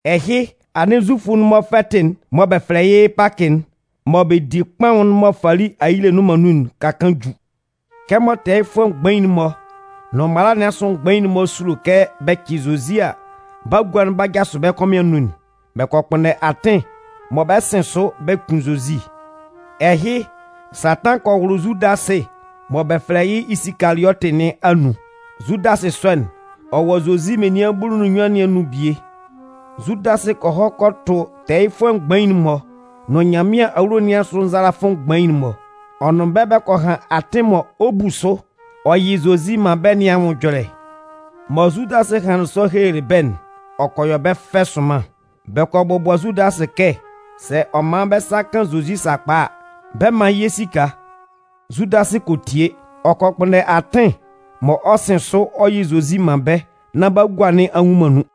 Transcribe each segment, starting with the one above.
Ɛhɩ, anɩn Zufʋ'n-mɔ fɛtɩ'n mɔ bɛ fɛlɛ yɩ́ Pakɩ'n, mɔ bɛ di kpaʋn'n mɔ fali ayile nnʋn man nun'n ka kaan ju. Kɛmɔ tɛɛyɩfʋɛ mgbain'n-mɔ nʋn mala nɩn asʋ mgbain'n-mɔ sulo kɛ bɛ cɩ Zozi a, bagua'n 'ba jasʋ bɛ kɔmɩn anun'n, bɛ kɔ kpʋnndɛ atɩn mɔ bɛ 'sɩn sʋ bɛ kun Zozi. Ɛhɩ, Satan kɔ wʋlʋ Zudasɩ mɔ bɛ fɛlɛ yɩ́ Isikaliɔtɩ nɩn anun. Zudasɩ sɔ'n, ɔ wɔ Zozi menian bulu nʋn nnyuan nɩn anun bie. Zudasɩ kɔ hɔ kɔ tʋ tɛɛyɩfʋɛ mgbain'n-mɔ nʋn Nyanmɩan awulo nɩn asʋ nzalafʋ mgbain'n-mɔ. Ɔ nʋn bɛ́ bɛ kɔ han atɩn mɔ ɔ 'bu sʋ ɔ yɩ Zozi man bɛ́ nɩn anwʋn ɛjɔlɛ. Mɔ Zudasɩ hanlɩn sɔ helelɩ bɛ́'n, ɔ kɔ yɔ bɛ́ fɛ sʋnman. Bɛ kɔ bɔbʋa Zudasɩ kɛ sɛ ɔ man bɛ sa kan Zozi sakpa a, bɛ 'man yɩ́ esika. Zudasɩ kɔ tie. Ɔ kɔ kpʋnndɛ atɩn mɔ ɔ 'sɩn sʋ ɔ yɩ Zozi man bɛ́ nán bagua nɩn a nnwun man nun.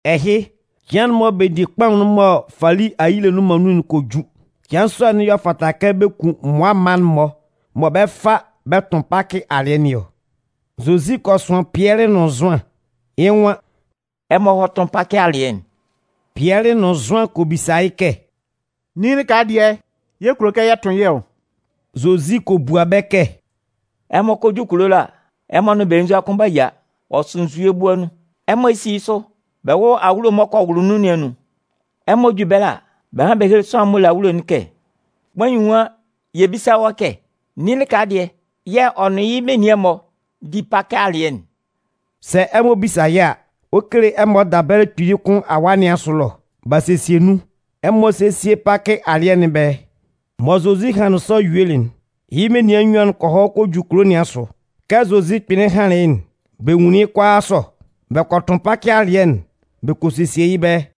Ɛhɩ, cɩan'n mɔ bɛ di kpaʋn'n mɔ fali ayile'n nnʋn man nun'n kɔ ju. Cɩan sɔ'n y'ɔ fata kɛ bɛ kun mmʋa mma'n-mɔ mɔ bɛ 'fa bɛ tʋn Pakɩ alɩɛ nɩn ɔ. Zozi kɔ sʋan Pɩɛlɩ nʋn Zʋan. Yɩ́ nwan: “Ɛmɔ hɔ́ tʋ́n yɛ́ Pakɩ alɩɛ'n.” Pɩɛlɩ nʋn Zʋan kɔ bisa yɩ́ kɛ: “Nin lɩka dɩɛ yɛ̂ ɛ kulo kɛ yɛ tʋn yɩ́ ɔ.” Zozi kɔ bua bɛ́ kɛ: “Ɛmɔ kɔ ju kulo ɛlɔ a, ɛmɔ nʋn belenzua kʋn 'ba yia. Ɔ sʋ nzue bua nun. Ɛmɔ sí yɩ́ sʋ bɛ wʋ́lʋ awulo'n m'ɔ kɔ wʋlʋ nun nɩn anun. Ɛmɔ ju ɛbɛlɛ a, bɛ hán bɛ héle sʋanlan'n m'ɔ le awulo'n kɛ: ‘Kpain nwan yɛ bísa wɔ́ kɛ: Nin lɩka dɩɛ yɛ̂ ɔ nʋn yɩ́ menian'n-mɔ bɛ 'di Pakɩ alɩɛ'n?’ Sɛ ɛmɔ bisa yɩ́ a, ɔ 'kele ɛmɔ dabɛlɛ kpili kʋn awaa nɩn asʋ ɛlɔ. B'a sesie nun. Ɛmɔ sésie Pakɩ alɩɛ nɩn ɛbɛlɛ.” Mɔ Zozi hanlɩn sɔ yuelɩ'n, yɩ́ menian nnyuan'n kɔ hɔ kɔ ju kulo nɩn asʋ. Kɛ Zozi kpɩnlɩn hanlɩn yɩ́'n, bɛ nwunlin yɩ́ kʋalaa sɔ. Bɛ kɔ tʋn Pakɩ alɩɛ'n bɛ kɔ sesie yɩ́ ɛbɛlɛ.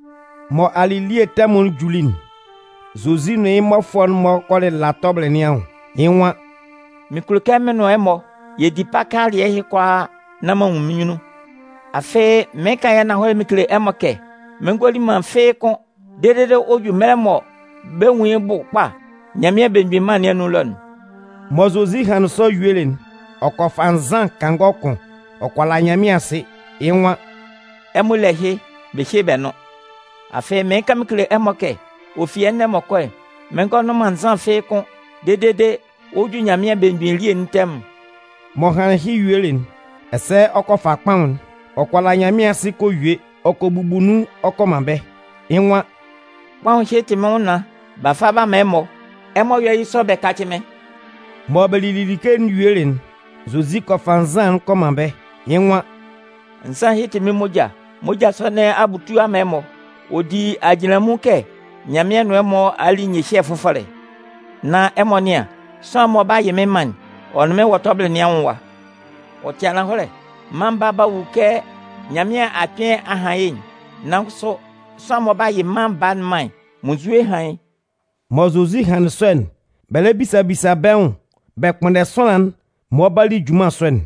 Mɔ alɩlie tɛmʋn'n juli'n, Zozi nʋn yɩ́ mmɔfʋɛ'n-mɔ kɔ lɩla tɔbɩlɩ nɩn anwʋn. Yɩ́ nwan: “Mɩn kulo kɛ mɩn nʋn ɛmɔ yɛ di Pakɩ alɩɛ ɛhɩ kʋalaa nán m'an nwun mɩ́n nyunnun. Afɩ mɩɩn kan yɩ́ ananhɔlɛ mɩn kele ɛmɔ kɛ, mɩn ngɔ li man fɩ́ɩ́ kʋ́n dede ɔ 'ju mɛlɛ mɔ bɛ 'nwun yɩ́ bʋ kpa Nyanmɩan Belemgbin Mân nɩn anun ɛlɔ'n.” Mɔ Zozi hanlɩn sɔ yuelɩ'n, ɔ kɔ fa nzan kangɔ kʋn. Ɔ kɔ la Nyanmɩan asɩ, yɩ́ nwan: “Ɛmɔ lé ɛhɩ bɛ hyé bɛ nʋ́n. Afɩ mɩɩn kan mɩn kele ɛmɔ kɛ, ɔ fi ɛnɛ m'ɔ kɔ'n, mɩn ngɔ nʋn man nzan fɩ́ɩ́ kʋ́n dede ɔ 'ju Nyanmɩan belemgbin elie'n tɛmʋn.” M'ɔ hanlɩn ɛhɩ yuelɩ'n, ɛsɛ ɔ kɔ fa kpaʋn'n. Ɔ kɔ la Nyanmɩan asɩ kɔ yue, ɔ kɔ bubu nun ɔ kɔ man bɛ́. Yɩ́ nwan: “Kpaʋn ɛhɩ tɩ mɩ́n nwʋnnaan. [B'a fa b'a man ɛmɔ. Ɛmɔ yɔ́ yɩ́ sɔ bɛ kácɩ mɩ́n.” Mɔ bɛ lili like'n yuelɩ'n, Zozi kɔ fa nzan'n kɔ man bɛ́. Yɩ́ nwan: “Nzan ɛhɩ tɩ mɩ́n moja. Moja sɔ nɩn a butu a man ɛmɔ. Ɔ di ajinlanmun kɛ Nyanmɩan nʋn ɛmɔ a li nyɩhyɛ fʋfɔlɛ.] Nan ɛmɔ nɩ́an, sʋanlan'n mɔ ɔ 'ba yɩ mɩ́n man'n, ɔ nʋn mɩ́n wɔ tɔbɩlɩ nɩn anwʋn ɛwa! Ɔ tɩ ananhɔlɛ, Mân Baa'n 'ba wu kɛ Nyanmɩan a kpɩn a han yɩ́'n. Nan kʋsʋ, sʋanlan'n mɔ ɔ 'ba yɩ Mân Baa'n man'n, munnzue hán yɩ́!” Mɔ Zozi hanlɩn sɔ'n, bɛ lɛ bisa bisa bɛ́ nwʋn bɛ kpʋnndɛ sʋanlan'n mɔ ɔ 'ba li junman sɔ'n.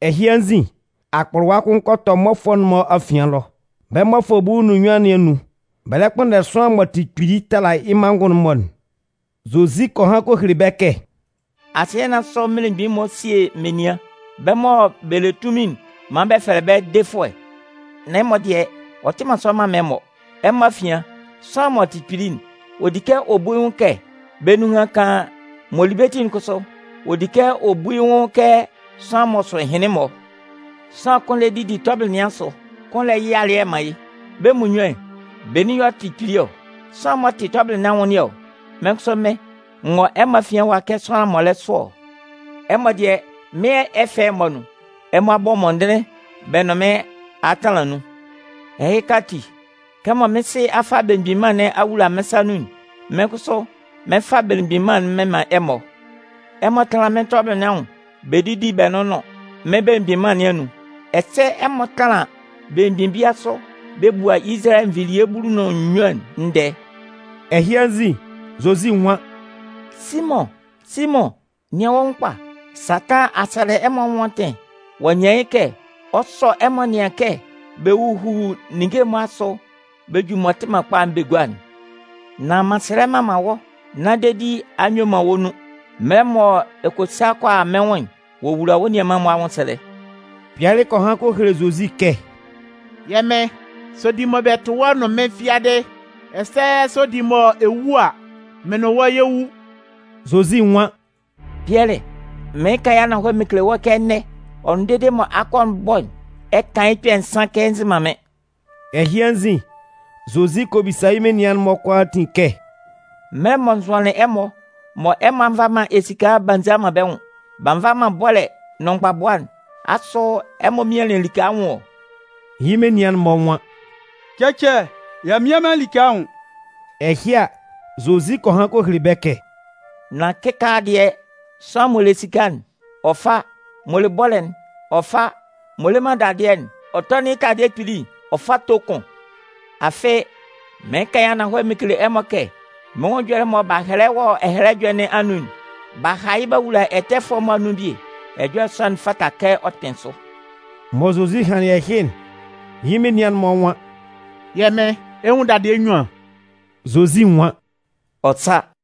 Ɛhɩ anzin, akpʋlʋwa kʋn kɔ tɔ mmɔfʋɛ'n-mɔ afian ɛlɔ. Bɛ́ mmɔfʋɛ bulu nʋn nnyuan nɩn anun, bɛ lɛ kpʋnndɛ sʋanlan m'ɔ tɩ kpili tala yɩ́ manngʋn'n-mɔ'n. Zozi kɔ han kɔ hele bɛ́ kɛ: “Asɩɛ nɩn asʋ mmelemgbin'n-mɔ sie menian. Bɛ́ mɔ bɛ le tunmin'n man bɛ fɛlɛ bɛ́ ‘Defʋɛ’. Nan ɛmɔ dɩɛ, ɔ tɩ man sɔ mman man ɛmɔ. Ɛmɔ afian, sʋanlan m'ɔ tɩ kpili'n, ɔ di kɛ ɔ bu yɩ́ nwʋn kɛ bɛ́ nunhan kaan. M'ɔ li bɛ́ ti'n kʋsʋ, ɔ di kɛ ɔ bu yɩ́ nwʋn kɛ sʋanlan m'ɔ sʋ ɛhɩnlɩn-mɔ. Sʋanlan kʋn lɛ didi tɔbɩlɩ nɩn asʋ, kʋn lɛ yɩ alɩɛ man yɩ́. Bɛ́ munnyuan'n, benin yɛ̂ ɔ tɩ kpili ɔ? Sɛ sʋanlan'n m'ɔ tɩ tɔbɩlɩ nɩn anwʋn nɩn ɔ? Mɩ́n kʋsʋ mɩ́n, n wɔ ɛmɔ afian ɛwa kɛ sʋanlan m'ɔ lɛ sʋ ɔ! Ɛmɔ dɩɛ, mɩ́n ɛfɛ'n-mɔ anun, ɛmɔ a bɔ mɔndɩnlɩn bɛ nʋn mɩn a tanlan nun. Ɛhɩka ati, kɛmɔ mɩ́n Sɩ a fa Belemgbin Mân nɩn a wula mɩ́n sa nun'n, mɩ́n kʋsʋ, mɩn 'fa Belemgbin Mân'n mɩn man ɛmɔ. Ɛmɔ 'tanlan mɩ́n tɔbɩlɩ nɩn anwʋn bɛ didi bɛ nʋnnʋn mɩ́n belemgbin mân nɩn anun. Ɛsɛ ɛmɔ 'tanlan belemgbin bia sʋ bɛ bua Izalayɛ nvilie bulu nʋn nnyuan'n ndɛɛ.” Ɛhɩ anzin, Zozi nwan: “Simʋn, Simʋn! Nɩan wɔ́ nwʋn kpa. Satan a sɛlɛ ɛmɔ anwʋn atɩn ɔ'a nyan yɩ́ kɛ ɔ 'sɔ ɛmɔ nɩan kɛ bɛ huhu ninnge'n-mɔ asʋ bɛ ju m'ɔ tɩ man kpa'n bɛ gua'n. Nan m'an sɛlɛ m'an man wɔ́ nán dedi a nyue man wɔ́ nun. Mɛlɛ mɔ ɛ kɔ sa kɔ a mɩ́n nwʋn'n, wowula wɔ́ nianman'n-mɔ anwʋnsɛlɛ.” Pɩɛlɩ kɔ han kɔ hele Zozi kɛ: “Yɛ́ Mɩn, sɛ ɔ di mɔ bɛ tʋ wɔ́ nʋn mɩ́n fiadɩ, ɛsɛ sɛ ɔ di mɔ ɛ wu a, mɩ́n nʋn wɔ́ yɛ 'wu.” Zozi nwan: “Pɩɛlɩ, mɩɩn kan yɩ́ ananhɔlɛ mɩn kele wɔ́ kɛ ɛnɛ, ɔ nʋn dede mɔ akɔ'n 'bɔ'n, ɛ kan yɩ́ kpɛ̂ nsan kɛ ɛ nzɩ man mɩ́n” Ɛhɩ anzin, Zozi kɔ bisa yɩ́ menian'n-mɔ kʋalaatin kɛ: “Mɛlɛ mɔ n zʋanlɩn ɛmɔ mɔ ɛmɔ a nva man esika b'a nza man bɛ́ nwʋn, b'a nva man bɔ́lɛ nʋn mgbabʋa'n, asʋ ɛmɔ mianlɩn like anwʋn ɔ?” Yɩ́ menian'n-mɔ nwan: “Cɛcɛ, y'a mmian man like anwʋn.” Ɛhɩ a, Zozi kɔ han kɔ hele bɛ́ kɛ: “Nan kɩkaala dɩɛ, sʋanlan m'ɔ le esika'n, ɔ fá. M'ɔ le bɔ́lɛ'n, ɔ fá. M'ɔ le man dadɩɛ'n, ɔ tɔ́nɩn yɩ́ taladɩɛ kpili'n ɔ fá tó kʋn. Afɩ, mɩɩn kan yɩ́ ananhɔlɛ mɩn kele ɛmɔ kɛ, mɩ́n nwʋn ɛjɔlɛ'n mɔ b'a hɛlɛ wɔ Ɛhɛlɛ Ɛjɔlɛ nɩn anun'n: B'a ha yɩ́ b'a wula ɛtɛfʋɛ'n-mɔ anun bie. Ɛjɔlɛ sɔ'n, ɔ fata kɛ ɔ kpɩn sʋ.” Mɔ Zozi hanlɩn ɛhɩ'n, yɩ́ menian'n-mɔ nwan: “Yɛ́ Mɩn, ɛ 'nwun dadɩɛ nnyuan.” Zozi nwan: “Ɔ sa.”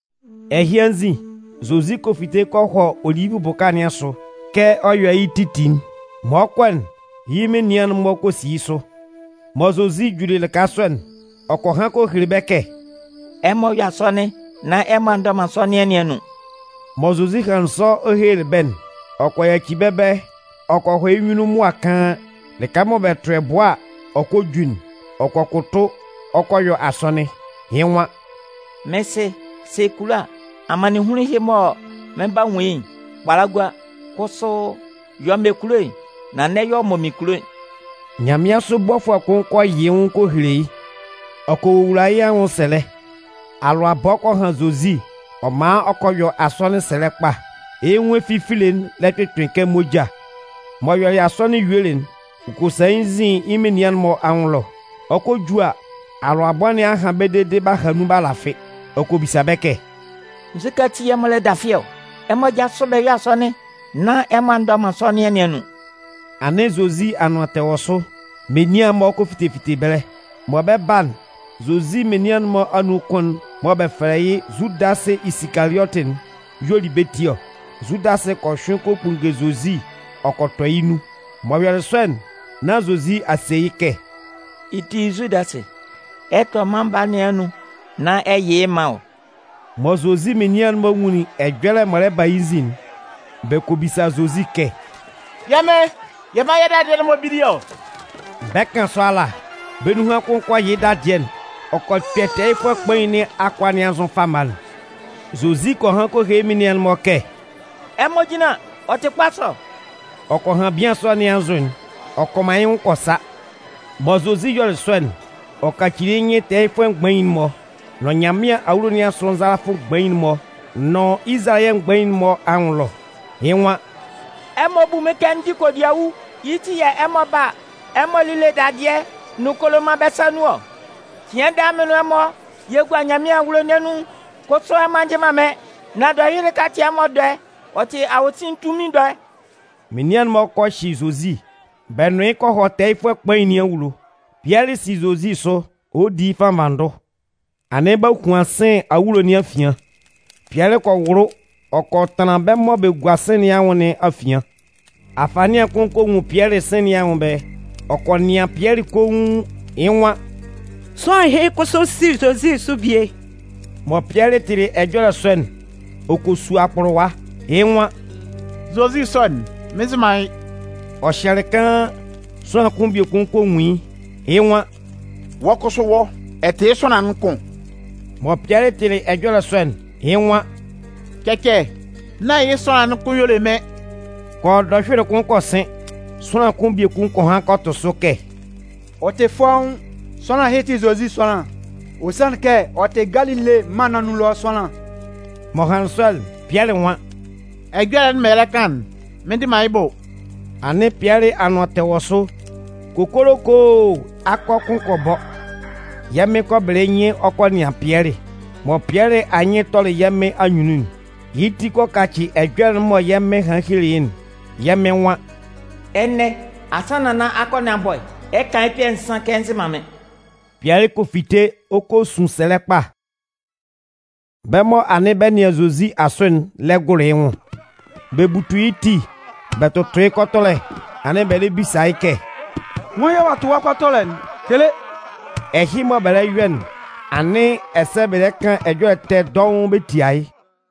Ɛhɩ anzin, Zozi kɔ fite kɔ hɔ Olivʋ bʋka nɩn asʋ kɛ ɔ yɔ yɩ́ titi'n. Mɔ ɔ 'kɔ'n, yɩ́ menian'n-mɔ kɔ si yɩ́ sʋ. Mɔ Zozi juli lɩka sɔ'n, ɔ kɔ han kɔ hele bɛ́ kɛ: “Ɛmɔ yɔ́ asɔnɩn nán ɛmɔ a ndɔ man sɔnɩan nɩn anun.” Mɔ Zozi hanlɩn sɔ ɔ helelɩ bɛ́'n, ɔ kɔ yaci bɛ́ ɛbɛlɛ ɔ kɔ hɔ yɩ́ nyunnun mʋa kaan, lɩka mɔ bɛ tʋ ɛbʋɛ a, ɔ kɔ ju'n. Ɔ kɔ kʋtʋ ɔ kɔ yɔ asɔnɩn. Yɩ́ nwan: “Mɩ́n Sɩ, sɛ ɛ kulo a, amannɩnhunlun ɛhɩ mɔ mɩn 'ba nwun yɩ́'n, kpala gua. Kʋsʋ, yɔ mɔ wɔ́ kunnun kulo'n, nan n'ɛ yɔ mɔ mɩ́n kunnun kulo'n.” [ Nyanmɩansʋ bɔfʋɛ kʋn kɔ yɩ yɩ́ nwʋn kɔ hele yɩ́. Ɔ kɔ wowula yɩ́ anwʋnsɛlɛ. Alʋabɔ kɔ han Zozi. Ɔ man ɔ kɔ yɔ asɔnɩn sɛlɛ kpa. Yɩ́ nwʋn efifile'n lɛ kpɩkpɩn kɛ moja.] M'ɔ yɔlɩ asɔnɩn yuelɩ'n, ɔ kɔ sa yɩ́ nzin yɩ́ menian'n-mɔ anwʋn ɛlɔ. Ɔ 'kɔ ju a, alʋabɔ nɩn a han bɛ́ dede b'a ha nun b'a lafɩ. Ɔ kɔ bisa bɛ́ kɛ: “Nzukɛ ati yɛ̂ ɛmɔ lɛ dafɩ ɔ? Ɛmɔ jásʋ bɛ yɔ́ asɔnɩn nán ɛmɔ a ndɔ man sɔnɩan nɩn anun!” Anɩn Zozi anʋan tɛ wɔ sʋ, menian-mɔ kɔ fite fite ɛbɛlɛ. Mɔ bɛ 'ba'n, Zozi menian'n-mɔ anun kʋn'n mɔ bɛ fɛlɛ yɩ́ Zudasɩ Isikaliɔtɩ'n y'ɔ li bɛ́ ti ɔ. Zudasɩ kɔ hyʋɩn kɔ kpunnge Zozi ɔ kɔ tɔ yɩ́ nun. M'ɔ yɔlɩ sɔ'n, nán Zozi a se yɩ́ kɛ: “Yɩ́ ti, Zudasɩ, ɛ 'tɔ Mân Baa nɩn anun nán ɛ yɩ yɩ́ man ɔ?” Mɔ Zozi menian'n-mɔ nwunlin ɛjɔlɛ m'ɔ lɛ ba yɩ́ nzin'n, bɛ kɔ bisa Zozi kɛ: “Yɛ́ Mɩn, yɛ mán yɛ́ dadɩɛ'n-mɔ bíli ɔ?” Bɛ 'kan sɔ ala, bɛ́ nunhan kʋn kɔ yɩ yɩ́ dadɩɛ'n, ɔ kɔ kpɛ tɛɛyɩfʋɛ kpain nɩn akʋa nɩn anzʋ fama'n. Zozi kɔ han kɔ hele yɩ́ menian'n-mɔ kɛ: “Ɛmɔ jínlan, ɔ tɩ kpa sɔ.” Ɔ kɔ han bian sɔ nɩn anzʋ'n, ɔ kɔ man yɩ́ nwʋn kɔ sa. Mɔ Zozi yɔlɩ sɔ'n, ɔ kɔ kaci yɩ́ nyɩn tɛɛyɩfʋɛ mgbain'n-mɔ, nʋn Nyanmɩan awulo nɩn asʋ nzalafʋ mgbain'n-mɔ nʋn Izalayɛ mgbain'n-mɔ anwʋn ɛlɔ. Yɩ́ nwan: “Ɛmɔ bu mɩ́n kɛ n dɩ kodiawu. Yɩ́ ti yɛ̂ ɛmɔ 'ba a, ɛmɔ lile dadɩɛ nʋn koloman-mɔ bɛ́ sa nun ɔ? Cɩan daa mɩn nʋn ɛmɔ yɛ gua Nyanmɩan awulo nɩn anun, kʋsʋ ɛmɔ a njɩ man mɩ́n. Nan dɔhyʋɩlɩ ɛhɩka tɩ ɛmɔ dɔɛ, ɔ tɩ awosin tunmin dɔɛ.” Menian'n-mɔ kɔ hyɩ Zozi, bɛ nʋn yɩ́ kɔ hɔ tɛɛyɩfʋɛ kpain nɩn awulo. Pɩɛlɩ si Zozi sʋ ɔ di yɩ́ fannvanndʋ. Anɩn b'a huan sɩ̂n awulo nɩn afian. Pɩɛlɩ kɔ wʋlʋ ɔ kɔ tanlan bɛ́ mɔ bɛ gua sɩ̂n nɩn anwʋn nɩn afian. Afanɩan kʋn kɔ nwun Pɩɛlɩ sɩ̂n nɩn anwʋn ɛbɛlɛ. Ɔ kɔ nɩan Pɩɛlɩ koun, yɩ́ nwan: “Sʋanlan ɛhɩ kʋsʋ si Zozi sʋ bie!” Mɔ Pɩɛlɩ tɩlɩ ɛjɔlɛ sɔ'n, ɔ kɔ su akpʋlʋwa. Yɩ́ nwan: “Zozi sɔ'n, mɩn nzɩ man yɩ́.” Ɔ hyɛlɩ kaan, sʋanlan kʋn biekun kɔ nwun yɩ́, yɩ́ nwan: “Wɔ́ kʋsʋ wɔ́, ɔ tɩ yɩ́ sʋanlan'n kʋn!” Mɔ Pɩɛlɩ tɩlɩ ɛjɔlɛ sɔ'n, yɩ́ nwan: “Cɛcɛ, nán yɩ́ sʋanlan'n kʋn y'ɔ le mɩ́n.” Kɔ yɔ dɔhyʋɩlɩ kʋn kɔ sɩn. Sʋanlan kʋn biekun kɔ han kɔ tʋ sʋ kɛ: “Ɔ tɩ fɔ́ʋ́n, sʋanlan ɛhɩ tɩ Zozi sʋanlan. Ɔ sanlɩn kɛ ɔ tɩ Galile mân nɩn anun ɛlɔ sʋanlan.” M'ɔ hanlɩn sɔ'n, Pɩɛlɩ nwan: “Ɛjɔlɛ'n mɔ ɛ lɛ kan'n, mɩn ndɩ man yɩ́ bʋ.” Anɩn Pɩɛlɩ anʋan tɛ wɔ sʋ, kokolokoo! Akɔ kʋn kɔ bɔ. Yɛ́ Mɩn kɔ bɩlɩ yɩ́ nyɩn ɔ kɔ nɩan Pɩɛlɩ. Mɔ Pɩɛlɩ anyɩn tɔlɩ yɛ́ Mɩn anyunnun'n, yɩ́ ti kɔ kacɩ ɛjɔlɛ'n mɔ yɛ́ Mɩn hanlɩn helelɩ yɩ́'n. Yɛ́ Mɩn nwan: “Ɛnɛ, asannan nán akɔ nɩn a bɔ'n, ɛ 'kan yɩ́ kpɛ̂ nsan kɛ ɛ nzɩ man mɩ́n.” Pɩɛlɩ kɔ fite ɔ kɔ sun sɛlɛ kpa. Bɛ́ mɔ anɩn bɛ nɩan Zozi asʋ'n lɛ gʋlʋ yɩ́ nwʋn. Bɛ butu yɩ́ ti bɛ tʋtʋ yɩ́ kɔtɔlɛ anɩn bɛ lɛ bisa yɩ́ kɛ: “Nwan yɛ̂ ɔ'a tʋ wɔ́ kɔtɔlɛ'n? Kele!” Ɛhɩ mɔ bɛ lɛ yɔ'n, anɩn ɛsɛ bɛ lɛ kan ɛjɔlɛ ɛtɛ dɔʋn bɛ tia yɩ́.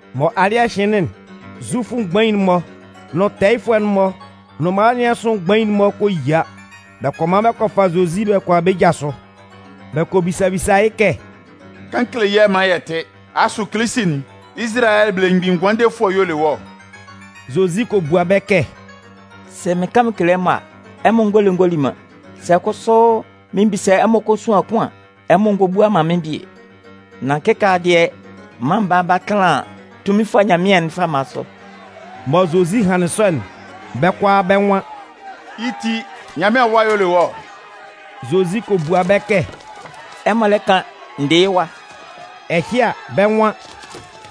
Mɔ alɩ́ɛ hɩnlɩn'n, Zufʋ mgbain'n-mɔ, nʋn tɛɛyɩfʋɛ'n-mɔ nʋn mala nɩn asʋ mgbain'n-mɔ kɔ yia. Bɛ kɔ man bɛ kɔ fa Zozi bɛ kɔ a bɛ́ ja sʋ. Bɛ kɔ bisa bisa yɩ́ kɛ: “Kan kele yɛ́ maan yɛ tɩ́. Asʋ Kilisi'n, Izalayɛ Belemgbin Ngʋandefʋɛ'n y'ɔ le wɔ́ ɔ?” Zozi kɔ bua bɛ́ kɛ: “Sɛ mɩn kan mɩn kele ɛmɔ a, ɛmɔ ngɔ le ngɔ li man. Sɛ kʋsʋ mɩn bisa ɛmɔ kosuan kʋn an, ɛmɔ ngɔ bua man mɩ́n bie. Nan kɩkaala dɩɛ, Mân Baa'n 'ba tanlan tunminfʋɛ Nyanmɩan'n fama sʋ.” Mɔ Zozi hanlɩn sɔ'n, bɛ́ kʋalaa bɛ́ nwan: “Yɩ́ ti, Nyanmɩan Awa y'ɔ le wɔ́?” Zozi kɔ bua bɛ́ kɛ: “Ɛmɔ lɛ kan. N dɩ yɩ́ Wa.” Ɛhɩ a, bɛ́ nwan: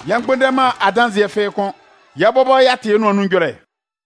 “Yɛ mgbʋnndɛ man adanzɩɛ kʋ́n! Yɛ́ bɔbɔ muonun y'a tɩ yɩ́ nʋan nun ɛjɔlɛ.”